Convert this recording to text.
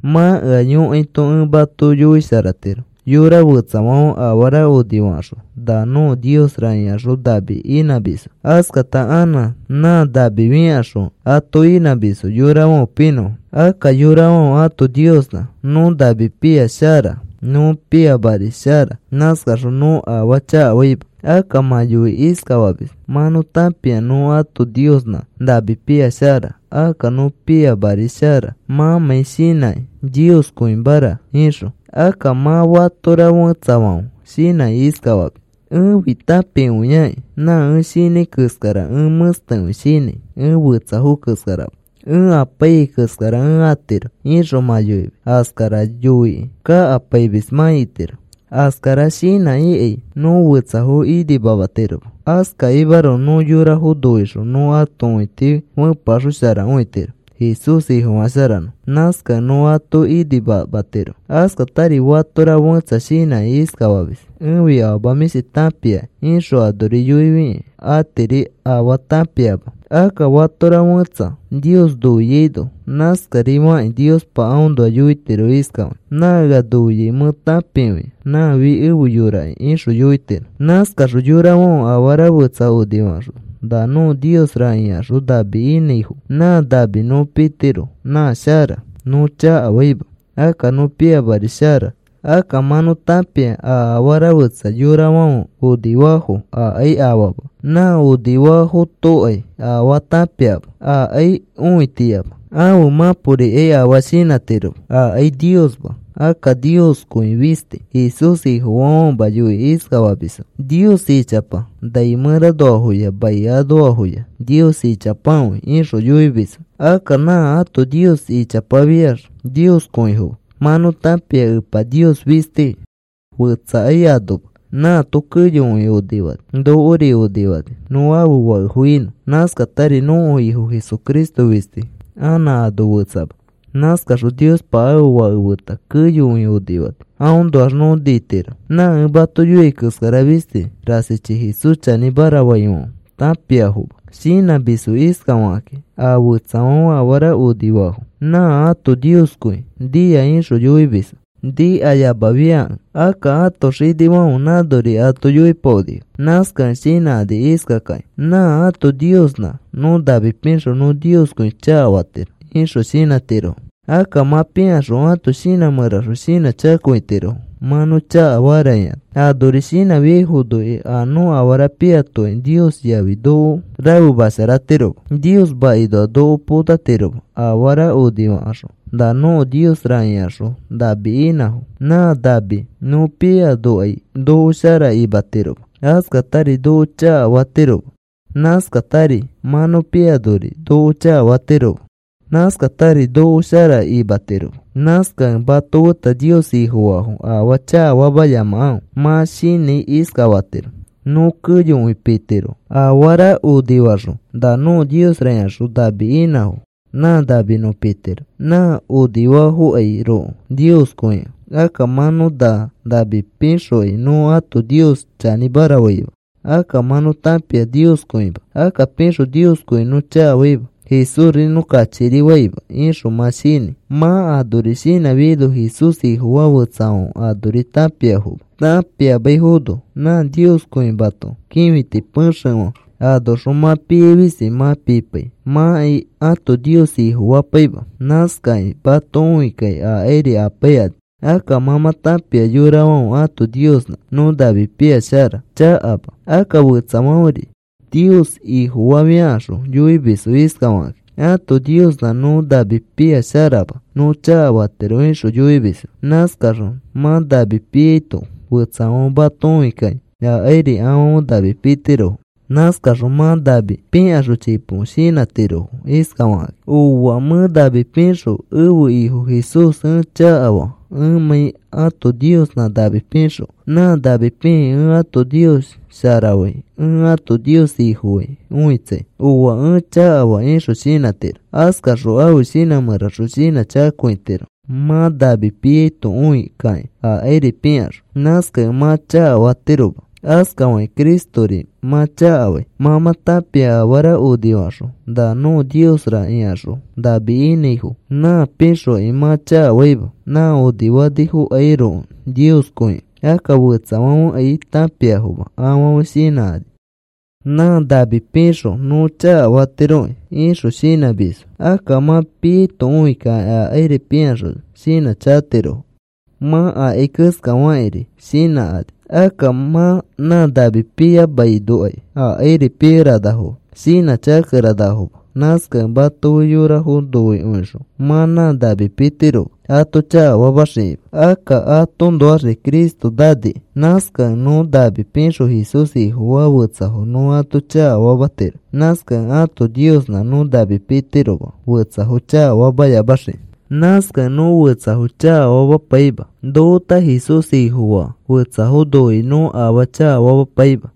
Mã ea yõkaito ẽ mato yoisharatiro. Yora fetsafãfe afara onifakaxõ, “Na nõko niosra,” ikaxõ nami inãmisfo. Askata anã nã nami fikaxõ ato inãmisfo yorafãfe pinõfo. Akka yorafãfe ãto niosnã nõ nami pia, shara. Nõ piamari, shara. Nãskaxõ nõ afaa chakafaima. Akka mã yoikĩ iskafamis: “Mã nõ tãpia nõ ãto niosnã nami pia, shara. Akka nõ piamari, shara,” mãmãi shinãkĩ Nioskõimara ixõ. Akka mã fatora fetsafãfe shinãkĩ iskafamis: “Ẽfi tãpikõiaki. Nã ẽ shinãi keskara ẽ mẽstekõi shinãi. Ẽ fetsafo keskarama. Ẽ apaiyai keskara ẽ atiro,” ixõ mã yoimis. Askara yoi kakapaimis mã itiro. Askara shinãkĩkai nõ fetsafo inimamatiroma. Askakimaroko nõ yorafo noixõ nõ ãto õiti fepeaxosharakõitiro Jesús Ifofasharanõfo. Nãskakẽ nõ ato inimamatiro. Askatari fatora fẽtsa shinãkĩ iskafamis: “Ẽfi afama mĩshti tãpiakĩ,” ixõ anori yoifikĩ atiri afaa tãpiama. Akka fatora fẽtsa Nios noiaino nãskarifakĩ Niospa aõnoa yoitiro iskafakĩ: “Nã ea noiai mẽ tãpikõia. Nãfi efe yoraki,” ixõ yoitiro. Nãskaxõ yorafãfe afara fetsa onifakaxõ, “Na nõko niosra,” ikaxõ nami inãifo. Nã nami nõ pitiro. Nã shara. Nõ chakafaima. Akka nõ piamari, shara. Akka mã nõ tãpia a afara fetsa yorafãfe onifafo akai afama. Nã onifafotokai afaa tãpiama. Akai õitiyama. Ãfe mãporikai afaa shinãtiroma. Akai Niosma. Akka Nioskõi fisti. Jesús Ifofaafãfema yoikĩ iskafamisfo: “Nios ichapa. Nai mẽranoafoya mai anoafoya nios ichapakõi,” ixõ yoimisfo. Akka nã ãto nios ichapafiax Nioskõifoma. Mã nõ tãpia Epa Niosfi fistiki. Fetsakai anoma. Nãato keyokõi onifani. Nokori onifani nõ ãfe fakefo inõ. Nãskatari nõko Ifo Jesucristori fisti. Anã ano fetsama. Nãskaxõ Niospa ãfe Fake feta keyokõi onifani. Aõnoax nõ nitiro. Nã ẽ mato yoiai keskara fisti rasichi Jesús chanĩmara faifãfe tãpiafoma. Shinãmisfo iskafakakĩ: “A fetsafãfe afara onifafo, nã ãto nioskõi nia,” ixõ yoimisfo niyamafiakẽ. Akka ãto xinifãfe nãnori ato yoipaonifo. Nãskakẽ shinãkani iskakakĩ: “Nã ãto niosnã nõ nami pixõ nõ Nioskõi chakafatiro,” ixõ shinãtirofo. Akka mã pikaxõ ãto shinã mẽraxõ shinãchakatirofo: “Mã nõ chakafara,” ikaxõ. Anori shinãfiaifonokai a nõ afara piatokai Nios yafi noko rafemasharatiroma. Nios makinoa noko potatiroma. Afara onifakaxõ, “Na nõko niosra,” ikaxõ nami inãfo nã nami nõ piamanokai noko shara imatiroma. Askatari noko chakafatiroma. Nãskatari mã nõ pianori noko chakafatiroma. Nãskatari noko shara imatiroma. Nãskakẽ mato feta Nios Ifofaafo afaa chakafamayamakãfe. Mã shinãi iskafakĩ: “Nõ keyokõi pitiro. Afara onifakaxõ, ‘Na nõko niosra,’ ikaxõ nami inãfo. Nã nami nõ pitiro nã onifafokairoko Nioskõikẽ. Akka mã nõ na nami pixokai nõ ãto nios chanĩmara faima. Akka mã nõ tãpia Nioskõima. Akka pixõ Nioskõi nõ chakafaima. Jesúsri nõ kachikirifaima,” ixõ mã shinãi. Mã anori shinãfiaino Jesús Ifofaa fetsafãfe anori tãpiafoma. Tãpiamaifono nã nioskõimato kĩfiti pexefã anoxõ mã piai fisti mã pipai mãkai ãto nios ifofapaima, nãskakĩ mato õikakĩ akairi apaikani. Akka mã mã tãpia yorafãfe ãto niosnã nõ nami pia shara, chakama. Akka fetsafãferi Nios Ifofafiakaxõ yoimisfo iskafakakĩ: “Ãto niosnã nõ nami pia sharama, nõ chakafatiro,” ixõ yoimisfo. Nãskaxõ mã nami piaito fetsafãfe mato õikakĩ akairi afãfe nami pitirofo. Nãskaxõ mã nami pikaxõ chipo shinãtirofo iskafakakĩ: “Ooa, mẽ nami pixõ ẽfe Ifo Jesús ẽ chakafaa ẽmãi ãto niosnã nami pixõ. Nã nami pikĩ ẽ ãto nios sharafai. Ẽ ãto nios ifofai õitsai. Ooa, ẽ chakafaa,” ixõ shinãtiro. Askaxõ ãfe shinã mẽraxõ shinãchakakõitiro mã nami piaito õikakĩ akairi pikaxõ. Nãskakẽ mã chakafamatiro. Askafakĩ Cristori mã chakafai. Mã mã tãpia afara onifakaxõ, “Na nõko niosra,” ikaxõ nami inãifo nã pixokai mã chakafaima nã onifafokairoko Nioskõikẽ. Akka fetsafãfekai tãpiafoma. Afãfe shinãkani: “Nã nami pixõ nõ chakafatiroki,” ixõ shinãmisfo. Akka mã piaito õikakĩ akairi pikaxõ shinãchakatirofo. Mã akai keskafakĩri shinãkani. Akka mã nã nami piyamainokai akairi pikeranafoma. Shinãchakakeranafoma. Nãskakẽ mato fe yorafo noikõixõ mã nã nami pitiroma ato chakafamaxikima. Akka atoõnoaxri Cristo naniki. Nãskakẽ nõ nami pixõ Jesús Ifofaa fetsafo nõ ato chakafamatiro. Nãskakẽ ãto niosnã nõ nami pitiroma fetsafo chakafamayamaxikĩ. Nãskakẽ nõ fetsafo chakafamapaima. Nofeta Jesús Ifofaa fetsafo noikĩ nõ afaa chakafamapaima.